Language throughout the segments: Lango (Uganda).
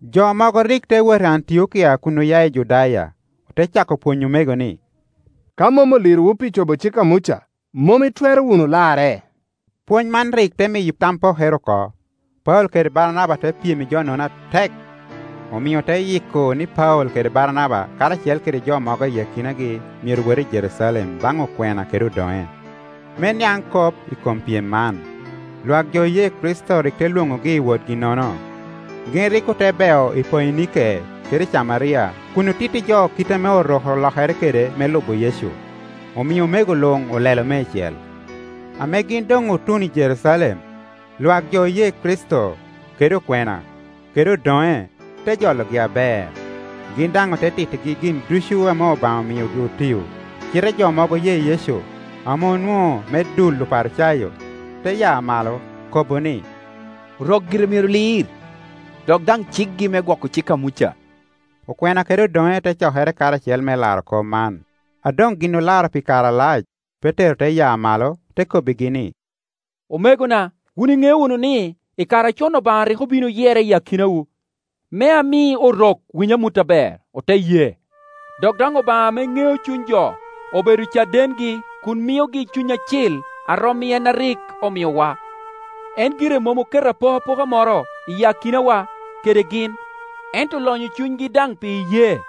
Jo mogo rik te wot i Antiokia kun oya i Judaya, ote cako pwonyo omego ni, “Ka mom olirowu pi cobo cik a Muca, mom itwero wunu larre.” Pwony man rik te miyo tam pokere oko, Paulo kede, Baranaba te pyem i jo-nono atek, omio ote yiko ni Paulo kede Baranaba karacel kede jo mogo i akinagi myero wot i Jerucalem baŋ okwena kede odoŋe, me niaŋ kop i kom pyem man. Lwak jo oye Kricito rik te lwokogi i wotgi-nono, gin rik ote beo i Poinike kede i Camaria kun otitti jo kit ame Orok olokere kede me lubo Yecu; omio omego luŋ olelo meicel. Ame gin doŋ otuno i Jerucalem lwak jo oye Kricito, kede okwena, kede odoŋe te jologi aber, gin daŋ ote tittigi gin ducu ame Obaŋa omiogi otio. Cite jo mogo oye Yecu, ame onwoŋo me dul Oparicayo, te ya malo, kobo ni, “Orok gire myero lir, dok daŋ cikgi me gwoko cik a Muca.” Okwena kede odoŋe te cokere karacel me laro kop man. A doŋ gin olaro pi kare alac, Petero te ya malo, te kobbigi ni, “Omegona, wun iŋeo wunu ni i kare acon Obaŋa rik obin oyera i akinawu, me ami Orok winy amut aber, ote ye. Dok daŋ Obaŋa ame ŋeo cuny jo obedo cadengi kun miogi Cuny Acil a rom i en a rik omiowa. En gire mom oketo apokapoka moro i akinawa kede gin, ento olonyo cunygi daŋ pi iyee.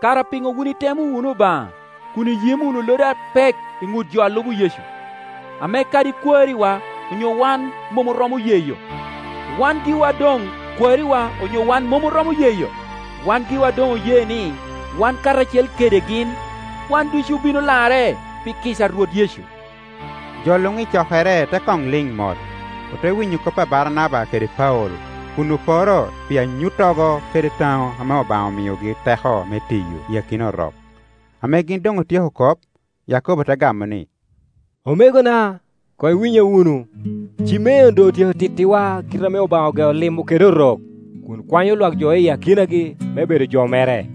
Kara piŋo wun itemo wunu Obaŋa kun iyimo wunu lodi apek i ŋut jo a lubo Yecu, ame kadi kwariwa onyo wan mom oromo yeyo? Wan giwa doŋ kwariwa onyo wan mom oromo yeyo? Wan giwa doŋ oye ni wan karacel kede gin, wan ducu obino larre pi kica a Rwot Yecu.” Jo luŋ i cokere te koŋ liŋ mot; ote winyo kop a Baranaba kede Paulo kun oporo pi anyuttogo kede taŋo ame Obaŋa omiogi teko me tiyo i akina Orok. Ame gin doŋ otyeko kop, Yakobo te gamo ni, “Omegona, koŋ iwinya wunu. Cimeon doŋ otyeko tittiwa kite ame Obaŋa ogeo limo kede Orok kun kwanyo lwak jo iyi akinagi me bed jo mere.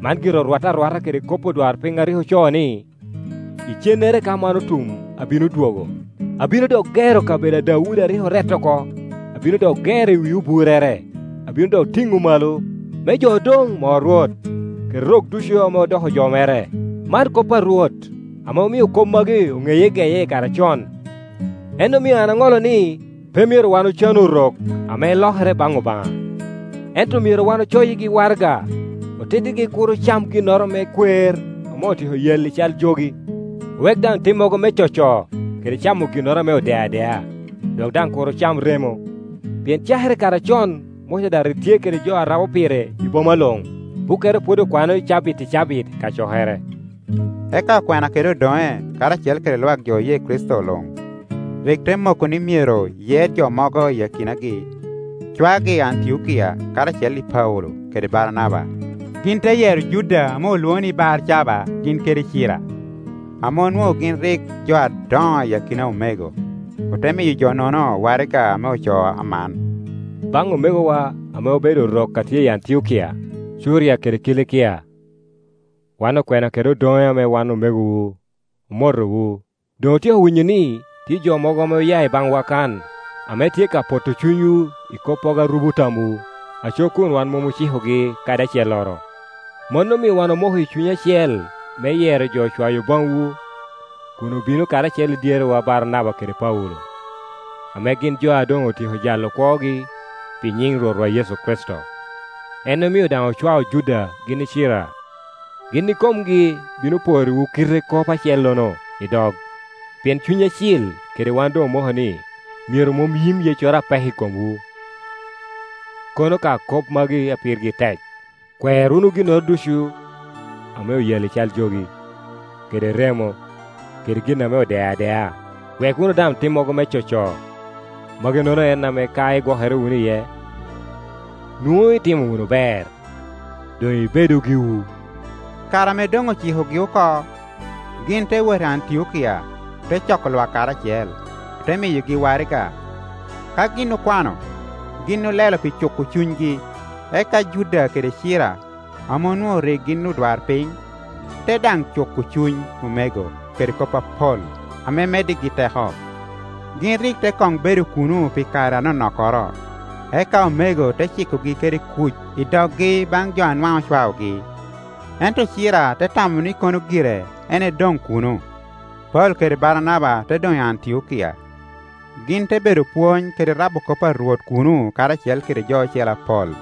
Man gire orwatte arwata kede kop odwarpiny a rik ocoo ni, ‘Icennere ka man otum abino dwogo, abino dok gero kabedo a Daudi a rik orette oko; abino dok gero i wi oburrere, abino dok tiŋo malo, me jo odoŋ mo Rwot, kede rok ducu ame odoko jo mere, Man kop a Rwot, ame omio kop magi oŋeye geye i kare acon.’ En omio an aŋolo ni pe myero wan ocanu Orok ame lokere baŋ Obaŋa, ento myero wan ocoyigi waraga, otittigi kur ocam ginnoro me kwer ame otyeko yalli cal jogi, owek daŋ timmogo me coco, kede camo ginnoro ame odeo adea, dok daŋ kur ocam remo. Pien cakere i kare acon Muca daŋ rik tye kede jo a rabo pire i boma luŋ; bukkere pwod okwano cabit i cabit i kacokere.” Eka okwena kede odoŋe, karacel kede lwak jo oye Kricito luŋ, rik te moko ni myero yer jo mogo iyi akinagi, cwagi Antiokia karacel i Paulo kede Baranaba. Gin te yero Juda ame olwoŋo ni Barcaba gin kede Cira, ame onwoŋo gin rik jo adoŋo i akina omego, ote miyo jo-nono waraga ame ocoo aman: “Baŋ omegowa ame obedo Orok a tye i Antiokia, Curia kede Kilikia, Wan okwena kede odoŋe ame wan omegowu, omotowu. Doŋ otyeko winyo ni tye jo mogo ame oya i baŋwa kan, ame tye ka poto cunywu i koppogo a rubo tamwu, aco kun wan mom ocikogi kadi acelloro. Mano omio wan omoko i cuny acel me yero jo cwayo baŋwu kun obino karacel i dyerewa Baranaba kede Paulo, ame gin jo a doŋ otyeko jalo kwogi pi nyiŋ Rwotwa Yecu Kricito. En omio daŋ ocwao Juda gin i Cira; gin ikomgi bino porriwu kite kop acellono i dog. Pien Cuny Acil kede wan doŋ omoko ni myero mom yim yeccoro apek i komwu, kono ka kop magi a pirgi tek: kwer wunu ginnoro ducu ame oyalli cal jogi, kede remo, kede gin ame odeo adea, wek wunu daŋ timmogo me coco. Maginono en ame ka igwokere wunu iye, nwoŋo itimo wunu ber. Doŋ ibedu giwu.” Kare ame doŋ ocikogi oko, gin te wot i Antiokia, ote coko lwak karacel, ote miyogi waraga. Ka gin okwano, gin olelo pi cuko cunygi. Eka Juda kede Cira, ame onwoŋo rik gin odwarpiny, te daŋ cuko cuny omego kede kop apol, ame meddigi teko. Gin rik te koŋ bedo kuno pi kare anonokkoro, eka omego te cikogi kede kuc i dokgi baŋ jo a nwaŋ ocwaogi. [ Ento Cira te tamo ni kono gire en edoŋ kuno.] Paulo kede Baranaba te doŋ i Antiokia. Gin te bedo pwony kede rabo kop a Rwot kuno karacel kede jo ocele apol.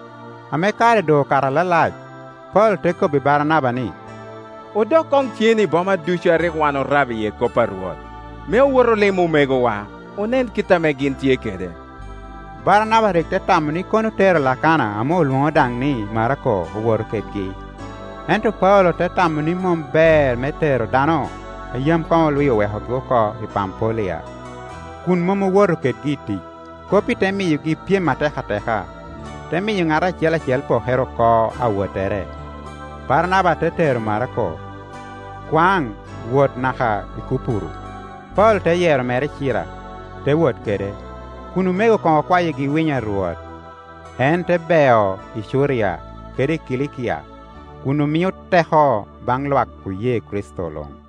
Ame kare doŋ okato alalac, Paulo te kobbi Baranaba ni, “Odok koŋ cen i boma ducu ame rik wan orabo iye kop a Rwot, me owot olim omegowa, onen kit ame gin tye kede.” Baranaba rik te tamo ni kono otero Lakana ame olwoŋo daŋ ni Marako owoto kedgi. Ento Paulo te tamo ni mom ber me tero dano a yam koŋ olwi owekogi oko i Pampulia, kun mom owoto kedgi i tic. Kop-pi te miyogi pyem atek ateka, te miyo ŋat acel acel pokere oko awottere. Baranaba te tero Marako, kwaŋ wot kede naka i Kupuru; Paulo te yero mere Cira, te wot kede, kun omego koŋ okwayigi winyo a Rwot. En te beo i Curia kede i Kilikia kun omio teko baŋ lwak oye Kricito luŋ.